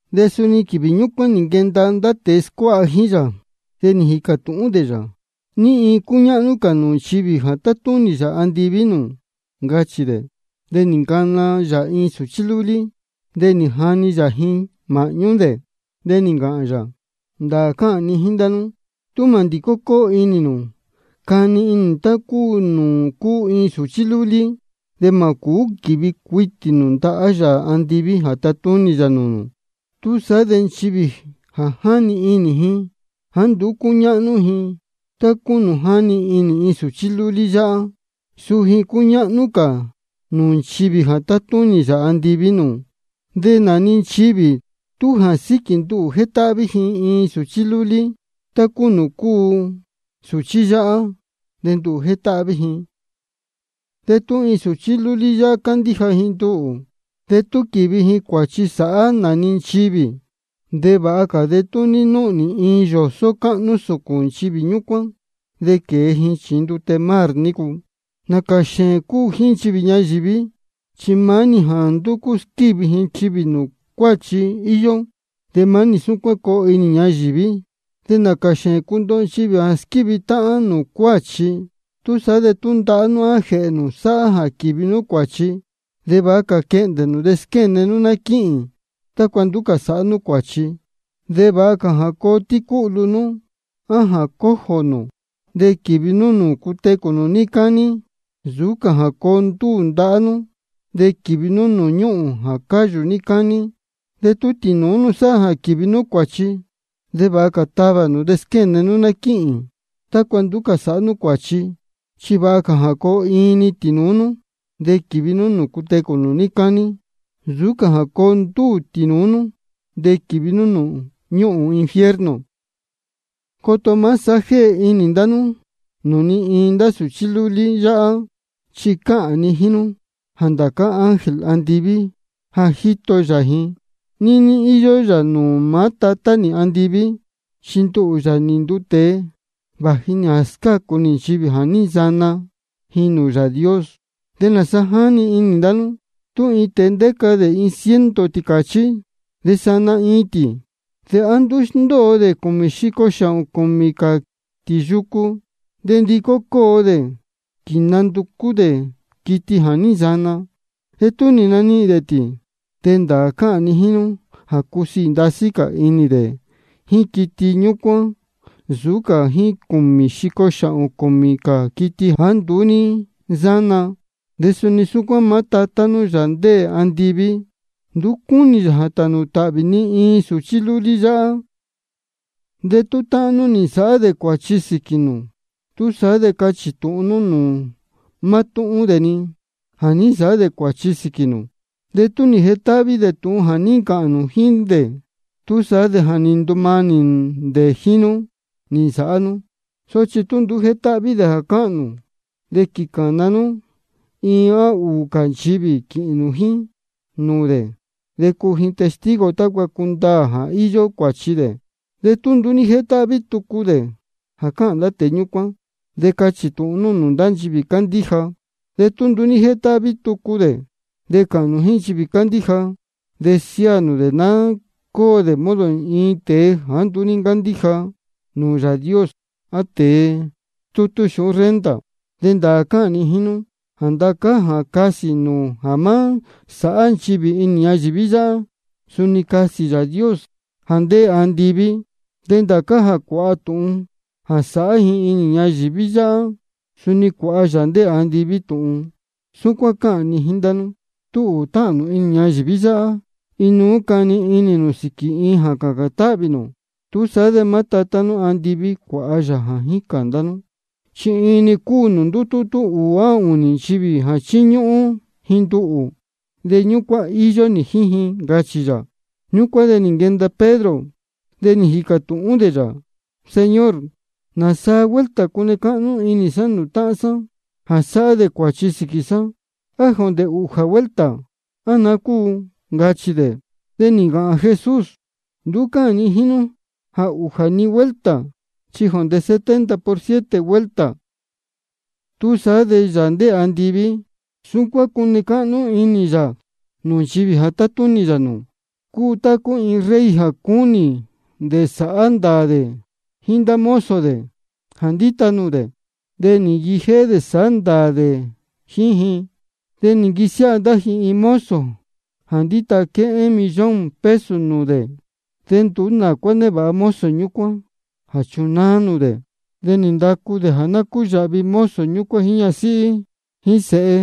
De suni quīvī ñúcuán nī nquenda ndá tēe scuáha jíín yā, de nī jīcā tūhún dē yā: ¿Ní iin cúñáhnú cā nūū nchivī jā tátúnī Yāā andiví nūū? ncachī dē. De nī ncana yā iin sūchí lúlí, de nī jani yā ji māhñú dē. De nī ncāhān yā: Ndāā cáhān ni jíín ndá nú, tú mā ndicó cóo inī nū cani inī nū tá cúu nūū cúu iin sūchí lúlí, de mā quívi cuitī nū ndahá Yāā andiví jā tatúnī yā nūū nū. Túsaá de nchivī jā jáni inī ji jāá nduú cúñáhnú ji, tá cúu nūū jáni inī sūchí lúlí yáhá, suu ji cúñáhnú cā nūū nchivī jā tátúnī Yāā andiví nūū. De nā-ni nchivī tú jā síquī nduhū jétáhví ji iin sūchí lúlí tá cúu nūū cúu sūchí yáhá, de nduhū jétáhví ji. De tú iin sūchí lúlí yáhá cándíja ji nduhū, de tú quīvi ji cuāchi sāhá nā-ni nchivī, de vāha cā de tú ní núhnī iin yōsó cáhnú sūcūn nchivī ñúcuán, de quēe ji chījin ndute mar nícu. Nācā xēēn cúu jíín nchivī ñayīví, chi maá-ni jā ndúcú squívi nchivī nūū cuāchi íyó. De maá-ni súcuán coo inī ñayīví. De nācā xēēn cundoho nchivī jā squívi táhán nūū cuāchi. Túsaá de tú ndahá nú á jēhē nū sáhá jā quīvi nú cuāchi, vāha cā quehndē nū de squéne nú ná quíhīn, tácua nduú cā sāhá nú cuāchi. Chi vāha cā jā coo tícúhlu nú á coo cojo nū de quīvi nú nūū cutecū nū níí cání, nsūú cā jā coo ndúū ndahá nú de quīvi nú nūū ñúhūn jā cáyū níí cání. De tú tīnūú nú sáhá jā quīvi nú cuāchi, vāha cā tavā nū de squéne nú ná quíhīn, tácua nduú cā sāhá nú cuāchi. Chi vāha cā jā coo iin-ni tīnūú nú de quīvi nú nūū cutecū nū níí cání, nsūú cā jā coo ndúū tīnūú nú de quīvi nú nūū ñúhūn infierno. Coto má sāhá jéhe inī ndá nú nūū ni iin ndá sūchí lúlí yáhá. Chi cáhān ni jíín nú jā ndācá ángel andiví jā jíto yā ji, níní íyó yā nūū maá Tatá nī andiví. Chi nduhū, Yāā nī nduu tēe, vāji nī jā scácu nī nchivī jā ní nsana ji nūū Yāā Dios. ¿De nāsa jáni inī ndá nú? Tú iin tēe ndéca dē iin ciento tīcāchí, de tú sana iin tī, ¿de á nduú sndóo dē cūmī xico xāhōn cūmī cā tī yucu, de ndicó dē quīnanducú dē quiti jā ní nsana? De tú nī nanihīn dē tī, de ndāā cáhān ni jíín nú jā cúsiī ndasí cā inī dē jíín quiti ñúcuán nsūú cā jíín cūmī xico xāhōn cūmī cā quiti jāá nduú ní nsána. De suni súcuán maá Tatá nú, Yāā ndéē andiví, nduú cúnī yā jā tānū tāhvī ni iin sūchí lúlí yáhá. De tú táhán nú nī nsāhá dē cuāchi sīquī nū, túsaá de cachī tūhun nú nūū mátúhún dē-ni jā ní nsāhá dē cuāchi sīquī nū. De tú nī jetáhví dē tūhun jā ní ncāhān nū jíín dē, túsaá de ja nī ndumanī dē jíín nú nī nsāhá nú. Sochi tú nduú ní jétáhví dē jā cáhān nū, de quīcāna nú iin á ūū cā nchivī quīhīn nū jíín nūū dē, de cuu ji testigo nū tácua cundaā jā íyó cuāchi dē. De tú nduú ní jétáhví tucu dē jā cáhān ndá tēe ñúcuán, de cachī tūhun nú nūū ndá nchivī cándíja. De tú nduú ní jétáhví tucu dē jā cáhān nchivī cándíja, de siáā nū dē ná cóo dē modo iin tēe jāá nduú cándíja nūū Yāā Dios á tēe stútú xūhún renta. De ndāā cáhān ni jíín nú jā ndācá jā casī nū jā má sāhá nchivī inī ñayīví yáhá, suni casī Yāā Dios jā ndéē andiví. De ndācá jā cuāha nú tūhun jā sāhá ji inī ñayīví yáhá, suni cuāha Yāā ndéē andiví tūhun. De suni cáhān ni jíín ndá nú, tú ūū táhān nū inī ñayīví yáhá, inuú cani inī nū sīquī iin jā cācān táhvī nū, túsaá de maá Tatá nī andiví cuāha yā jā jícān ndá nú. Chi ní-ni cúu nūū ndútútú ūū á ūnī nchivī jā chíñúhún ji nduhū, de ñúcuán íyó nī jíín ji, ncachī yā. Ñúcuán de nī nquenda Pedro, de nī jīcā tūhún dē yā: Señor, ¿nāsaa vuelta cune cáhnú inī sá nūū táhán sá jā sáhá dē cuāchi sīquī sá? ¿A jondē siete vuelta, á naá cúu? ncachī dē. De nī ncāhān Jesús: Nduú cáhān ni jíín nú jā siete-ni vuelta, chi jondē setenta por siete vuelta. Túsaá de Yāā ndéē andiví, súcuán cúu jā née cáhnú inī yā nūū nchivī jā tátúnī yā nūū: Cúu tá cúu iin rey jā cúnī dē sāhá ndāā dē jíín ndá mozo dē jā ndíta nūū dē. De nī nquijéhé dē sáhá ndāā dē jíín ji. De nī nquisiáha ndá ji iin mozo jā ndíta quéhén millón peso nūū dē. De nduú nā cuá névāha mozo ñúcuán jā chunáá nūū dē. De nī ndacu dē jā ná cúyāhvi mozo ñúcuán jíín ñasíhí jíín sēhe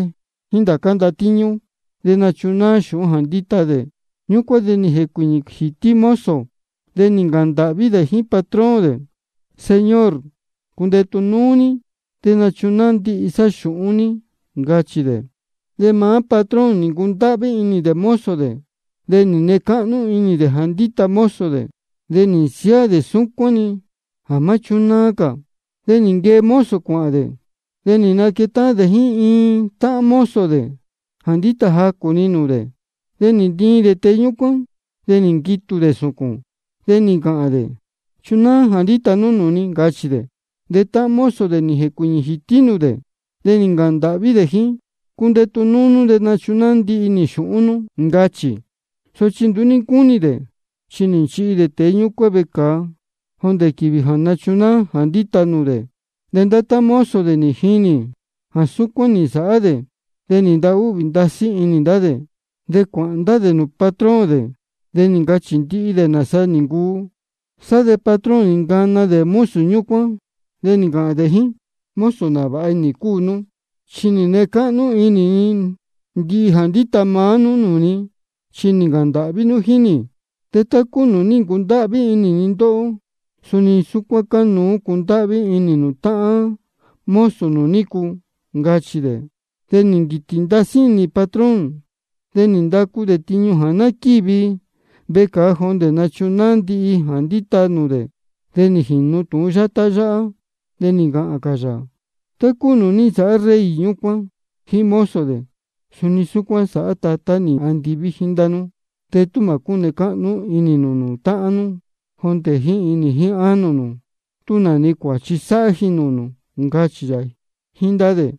jíín ndācá ndatíñú, de nūcunáá xūhún jā ndíta dē. Ñúcuán de nī jēcuīñī jītí mozo, de nī ncāhān ndāhví dē jíín patrón dē: Señor, cundetu núú ní, de nachunáá ndihi sá xūhún ní, ncachī dē. De maá patrón nī ncundáhví inī dē mozo dē. De nī nee cáhnú inī dē jā ndíta mozo dē, de nī nsiáā dē súcuán-ni jā má chúnáá cā. De nī nquee mozo cuāhān dē, de nī nquetáhán dē-ni jíín iin táhán mozo dē jā ndíta jacū-ni nūū dē. De nī ntiin dē tēe ñúcuán, de nī nquitū dē sūcūn, de nī ncāhān dē: Chunáá jā ndíta nú nūū ni, ncachī dē. De táhán mozo dē nī jēcuīñī jītí nūū dē, de nī ncāhān ndāhví jíín dē: Cundetu núú nú, de nachunáá ndihi nī xūhún nú, ncachī. Sochi nduú ní ncúnī dē, chi nī nchīhi dē tēe ñúcuán vecāa jondē quīvī jā nachunáá jā ndíta nūū dē. De ndá táhán mozo dē nī jinī jā súcuán nī nsāhá dē, de nī ntahúhvī ndasí inī ndá dē. De cuāhān ndá dē nūū patrón dē, de nī ncachī dē ndihi nāsa nī ncuu. Sá de patrón nī nacana dē mozo ñúcuán, de nī ncāhān dē jíín: Mozo nāvāha inī cúu nú. Chi nī nee cáhnú inī ni ndihi jā ndíta nú nūū ni, chi nī ncāhān ndāhví nú jíín nī. De tá cúu nūū ní ncundáhví inī ni ndóhó, suni súcuán cánuú jā cundáhví inī nū táhán mozo nū nícu, ncachī dē. De nī nquītī ndasí inī patrón, de nī ndacu dē tiñu jā ná quívi vecāa jondē nachunáá ndihi jā ndíta nūū dē. De nī jīnu tūhun yátá yáhá, de nī ncāhān cā yā: Tá cúu nūū ní nsāhá rey ñúcuán jíín mozo dē, suni súcuán sāhá maá Tatá nī andiví jíín ndá nú de tú mā cúne cáhnú inī nū nūū táhán nú jondē jíín inī jíín ánō nū, tú nā-ni cuāchi sáhá ji nūū nū, ncachī yā jíín ndá dē.